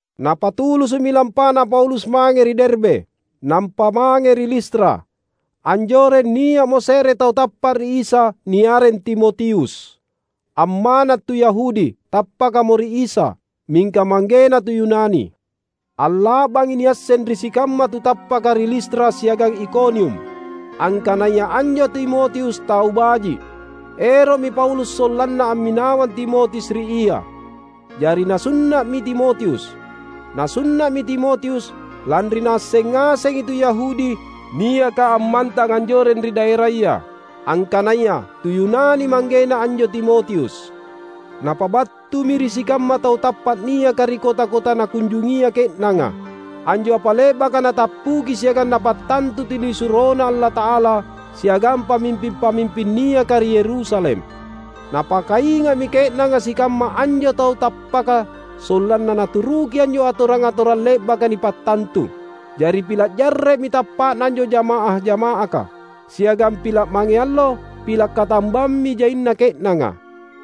Napatulusu’mi lampana Paulus mange ri Derbe, nampa mange ri Listra. Anjoreng nia’mo se’re tu tappa’ ri Isa niareng Timotius. Amma’na tu Yahudi, tappakamo ri Isa; mingka manggena tu Yunani. Alla’bangi niasseng ri sikamma tu tappaka ri Listra siagang Ikonium, angkanaya anjo Timotius tau baji’. Ero’mi Paulus sollanna amminawang Timotius ri ia; jari nasunna’mi Timotius. Nasunna’mi Timotius, lanri naasseng ngasengi tu Yahudi niaka ammantang anjoreng ri daeraya, angkanaya tu Yunani manggena anjo Timotius. Napabattumi ri sikamma tau tappa’ niaka ri kota-kota nakunjungia ke’nanga, anjo apa le’baka natappuki siagang napattantu tunisuroNa Allata’ala siagang pamimping-pamimping niaka ri Yerusalem. Napakainga’mi ke’nanga sikamma anjo tau tappaka sollanna naturuki anjo atorang-atorang le’baka nipattantu. Jari pila’ jarre’mi tappa’na anjo jamaah-jama’aka, siagang pila’ mange allo pila’ katambammi jaina ke’nanga.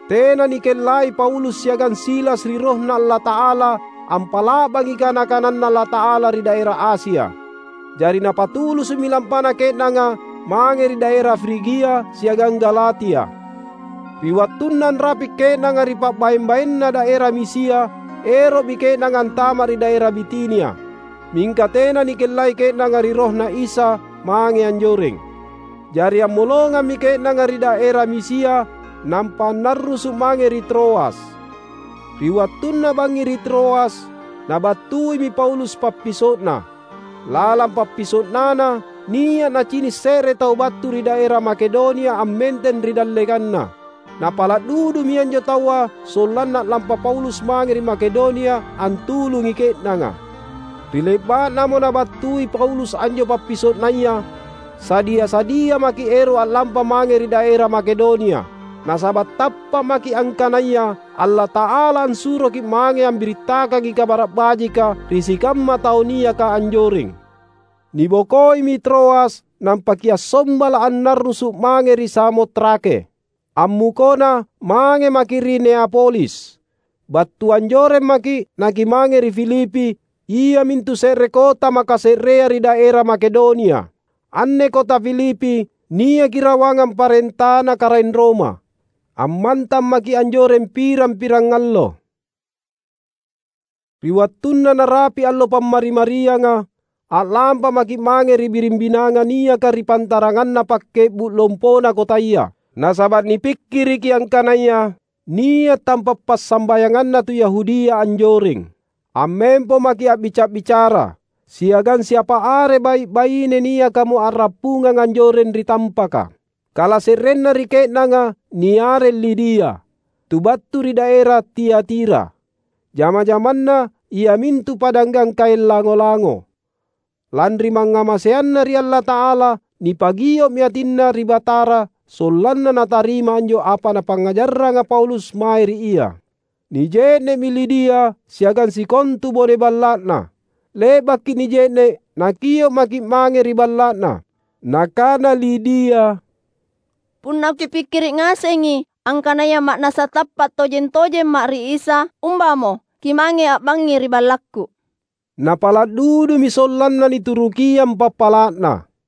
Tena nikellai Paulus siagang Silas ri RohNa Allata’ala ampa’la’bangi kana-kananNa Allata’ala ri daera Asia. Jari napatulusu’mi lampana ke’nanga mange ri daera Frigia siagang Galatia. Ri wattunna anrapi’ ke’nanga ri pa’baeng-baenna daera Misia, ero’mi ke’nanga antama’ ri daera Bitinia; mingka tena nikellai ke’nanga ri RohNa Isa mange anjoreng. Jari ammolongammi ke’nanga ri daera Misia nampa annarrusu’ mange ri Troas. Ri wattunna bangngi ri Troas, nabattuimi Paulus pappiso’na. Lalang pappiso’nana, nia’ nacini’ se’re tau battu ri daera Makedonia ammenteng ri dallekanna. Napala’ dudumi anjo taua sollanna a’lampa Paulus mange ri Makedonia antulungi ke’nanga. Ri le’ba’namo nabattui Paulus anjo pappiso’naya, sadia-sadia maki’ ero’ a’lampa mange ri daera Makedonia. Nasaba’ tappa’ maki’ angkanaya Allata’ala assuroki’ mange ambirittakangi Kabara’ Bajika ri sikamma tau niaka anjoreng. Nibokoimi Troas nampa kiassombala’ annarrusu’ mange ri Samotrake. Ammukona mange maki’ ri Neapolis. Battu anjoreng maki’ nakimange ri Filipi, iamintu se’re kota makase’rea ri daera Makedonia. Anne kota Filipi, niaki rawangang parentana karaeng Roma. Ammantang maki’ anjoreng pirang-pirangallo. Ri wattunna narapi’ allo Pammari-marianga, a’lampa maki’ mange ri biring binanga niaka ri pantaranganna pakke’bu’ lompona kotaya. Nasaba’ nipikkiriki angkanaya nia’ tampa’ passambayanganna tu Yahudia anjoreng. Ammempo maki’ a’bica’-bicara siagang siapa are bai’-baine niakamo a’rappungang anjoreng ri tampaka. Kalase’renna ri ke’nanga niareng Lidia, tu battu ri daera Tiatira. Jama-jamanna iamintu padanggang kaeng lango-lango. Lanri mangngamaseanna ri Allata’ala, nipagio’mi atinna ri Batara sollanna natarima anjo apa napangngajarranga Paulus mae ri ia. Nije’ne’mi Lidia siagang sikontu bone balla’na. Le’baki nije’ne’, nakio’ maki’ mange ri balla’na. Nakana Lidia, "Punna kipikkiri’ ngasengi angkanaya ma’nassa tappa’ tojeng-tojemma’ ri Isa, umbamo kimange a’bangngi ri ballakku." Napala’ dudumi sollanna niturukiang pappala’na.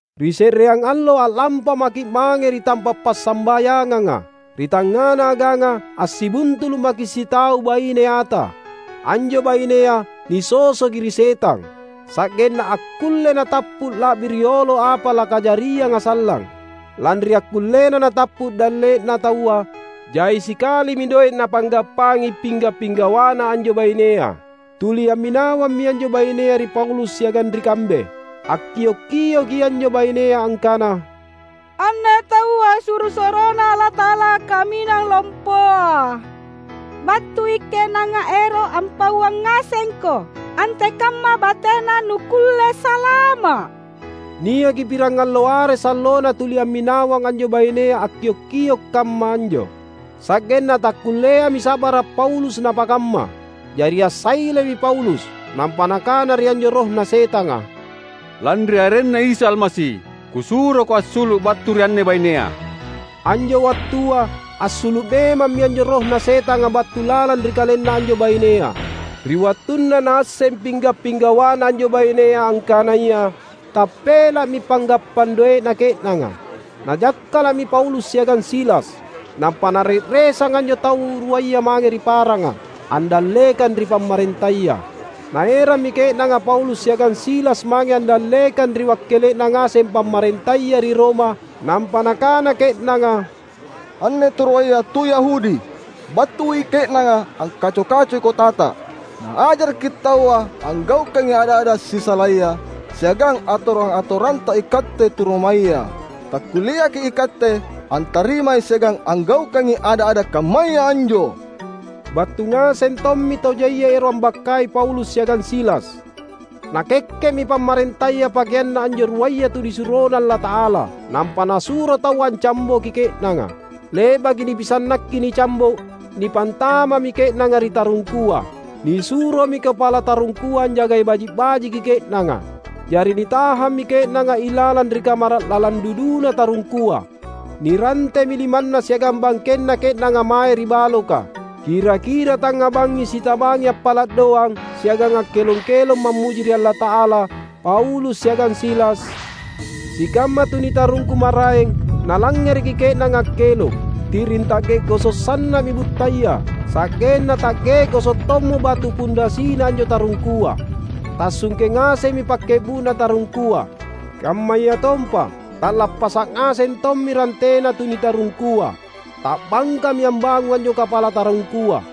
Ri se’reang allo a’lampa maki’ mange ri tampa’ passambayanganga. Ri tangngana aganga assibuntulu’ maki’ sitau baine ata. Anjo bainea nisosoki ri setang, sa’genna akkullei natappu la’bi riolo apa lakajarianga sallang. Lanri akkullena natappu dalle’na taua, jai sikalimi doe’ napanggappangi pingga’-pinggawana anjo bainea. Tuli amminawammi anjo bainea ri Paulus siagang ri kambe. Akkio’-kioki anjo bainea angkana, "Anne taua suro-suroNa Allata’ala Kaminang Lompoa! Battui ke’nanga ero’ ampauang ngasengko antekamma batena nukkulle salama’!" Niaki pirangallo are sallona tuli amminawang anjo bainea akkiok-kio’ kamma anjo. Sa’genna takkulleami sa’bara’ Paulus napakamma; jari assailemi Paulus, nampa nakana ri anjo rohna setanga, "Lanri arenNa Isa Almasi, kusuroko assulu’ battu ri anne bainea!" Anjo wattua, assulu’ memammi anjo rohna setanga battu lalang ri kalenna anjo bainea. Ri wattunna naasseng pingga’-pinggawana anjo bainea angkanaya tappela’mi panggappang doe’na ke’nanga, najakkala’mi Paulus siagang Silas, nampa nare’resang anjo tau ruaya mange ri paranga, andallekang ri pamarentaya. Naerammi ke’nanga Paulus siagang Silas mange andallekang ri wakkele’na ngaseng pamarentaya ri Roma; nampa nakana ke’nanga, "Anne tau ruaya tu Yahudi. Battui ke’nanga angkaco-kacoi kotata. Naajaraki taua anggaukangi ada’-ada’ sisalaya siagang atorang-atoranta ikatte tu Romaya. Takkulleaki’ ikatte antarimai siagang anggaukangi ada’-ada’ kammaya anjo!" Battu ngaseng tommi tau jaia ero’ ambakkai Paulus siagang Silas; nakekke’mi pamarentaya pakeanna anjo ruaya tunisuroNa Allata’ala, nampa nasuro taua ancamboki ke’nanga. Le’baki nipisannakki nicambo’ nipantama’mi ke’nanga ri tarungkua. Nisuromi kapala tarungkua anjagai baji’-bajiki ke’nanga. Jari nitahammi ke’nanga ilalang ri kamara’ lalang duduna tarungkua; nirantemi limanna siagang bangkenna ke’nanga mae ri baloka. Kira-kira tangnga bangngi sitabangi appala’ doang siagang akkelong-kelong mammuji ri Allata’ala Paulus siagang Silas. Sikamma tu nitarungku maraeng nalangngereki ke’nanga akkelong. Ti’ring ta’ge’goso’ sanna’mi buttaya, sa’genna ta’ge’goso’ tommo batu pundasina anjo tarungkua. Tassungke ngasemmi pakke’bu’na tarungkua, kammayatompa ta’lappasa’ ngaseng tommi rantena tu nitarungkua. Ta’bangkami ambangung anjo kapala tarungkua.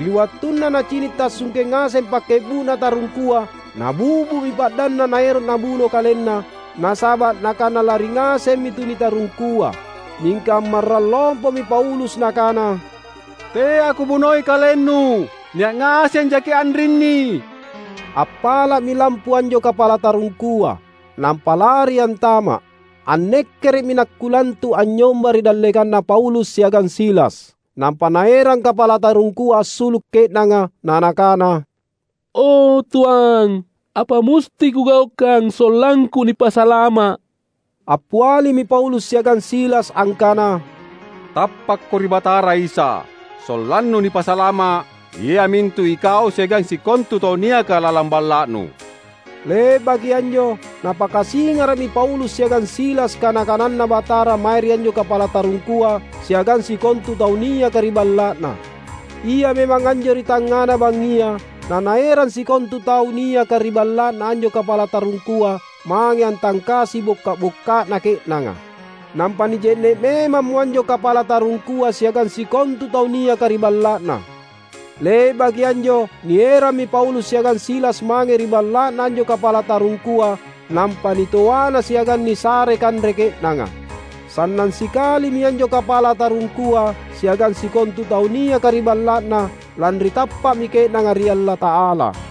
Ri wattunna nacini’ tassungke ngaseng pakke’bu’na tarungkua nabi’bu’mi pa’danna naero’ nabuno kalenna, nasaba’ nakana lari ngasemmi tu nitarungkua. Mingka ammarrang lompomi Paulus nakana, "Teako bunoi kalennu! Nia’ ngaseng jaki’ anrinni!" Appala’mi lampu anjo kapala tarungkua nampa lari antama’. Annekkere’mi nakkulantu’ anynyomba ri dallekanna Paulus siagang Silas. Nampa naerang kapala tarungkua assulu’ ke’nanga, na nakana, "O Tuang, apa musti kugaukang sollangku nipasalama’?" Appialimi Paulus siagang Silas angkana, "Tappakko ri Batara Isa, sollannu nipasalama’ — iamintu ikau siagang sikontu tau niaka lalang balla’nu!" Le’baki anjo napakasingara’mi Paulus siagang Silas kana-kananNa Batara mae ri anjo kapala tarungkua siagang sikontu tau niaka ri balla’na. Ia memang anjo ri tangngana bangngia, nanaerang sikontu tau niaka ri balla’na anjo kapala tarungkua mange antangkasi bokka’-bokka’na ke’nanga. Nampa nije’ne’ memammo anjo kapala tarungkua siagang sikontu tau niaka ri balla’na. Le’baki anjo nierammi Paulus siagang Silas mange ri balla’na anjo kapala tarungkua nampa nitoana siagang nisare kanre ke’nanga. Sannang sikalimi anjo kapala tarungkua siagang sikontu tau niaka ri balla’na, lanri tappa’mi ke’nanga ri Allata’ala.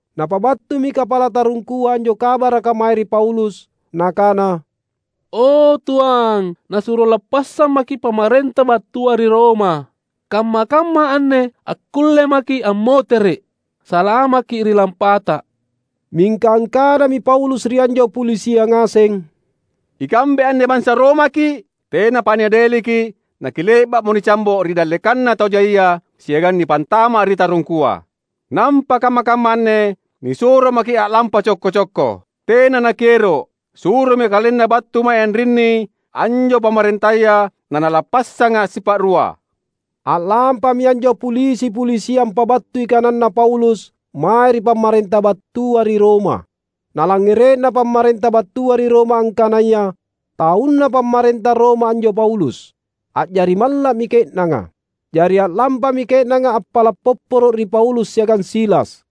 Napabattumi kapala tarungkua anjo kabaraka mae ri Paulus. Nakana, "O Tuang, nasuro lappassammaki’ pamarenta battua ri Roma. Kamma-kamma anne akkulle maki’ ammotere’. Salamakki’ ri lampata!" Mingka angkanami Paulus ri anjo pulisia ngaseng, "Ikambe anne bansa Romaki’. Tenapa niadeliki’ nakile’ba’mo nicambo’ ri dallekanna tau jaia siagang nipantama’ ri tarungkua. Nampa kamma-kamma anne nisuro maki’ a’lampa cokko-cokko. Tena nakiero’! Suromi nakalenna battu mae anrinni anjo pamarentaya nanalappassanga’ sipa’rua." A’lampami anjo pulisi-pulisia ampabattui kananna Paulus mae ri pamarenta battua ri Roma. Nalangngere’na pamarenta battua ri Roma angkanaya taunna pamarenta Roma anjo Paulus, a’jari malla’mi ke’nanga. Jari a’lampami ke’nanga appala’ popporo’ ri Paulus siagang Silas.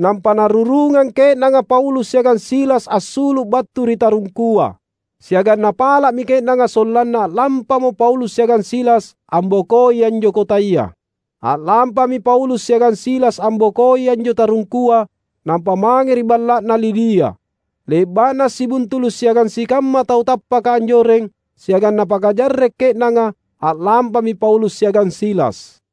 Nampa narurungang ke’nanga Paulus siagang Silas assulu’ battu ri tarungkua, siagang napala’mi ke’nanga sollanna a’lampamo Paulus siagang Silas ambokoi anjo kotaya. A’lampami Paulus siagang Silas ambokoi anjo tarungkua, nampa mange ri balla’na Lidia. Le’ba’na assibuntulu’ siagang sikamma tau tappaka anjoreng, siagang napakajarre’ ke’nanga, a’lampami Paulus siagang Silas.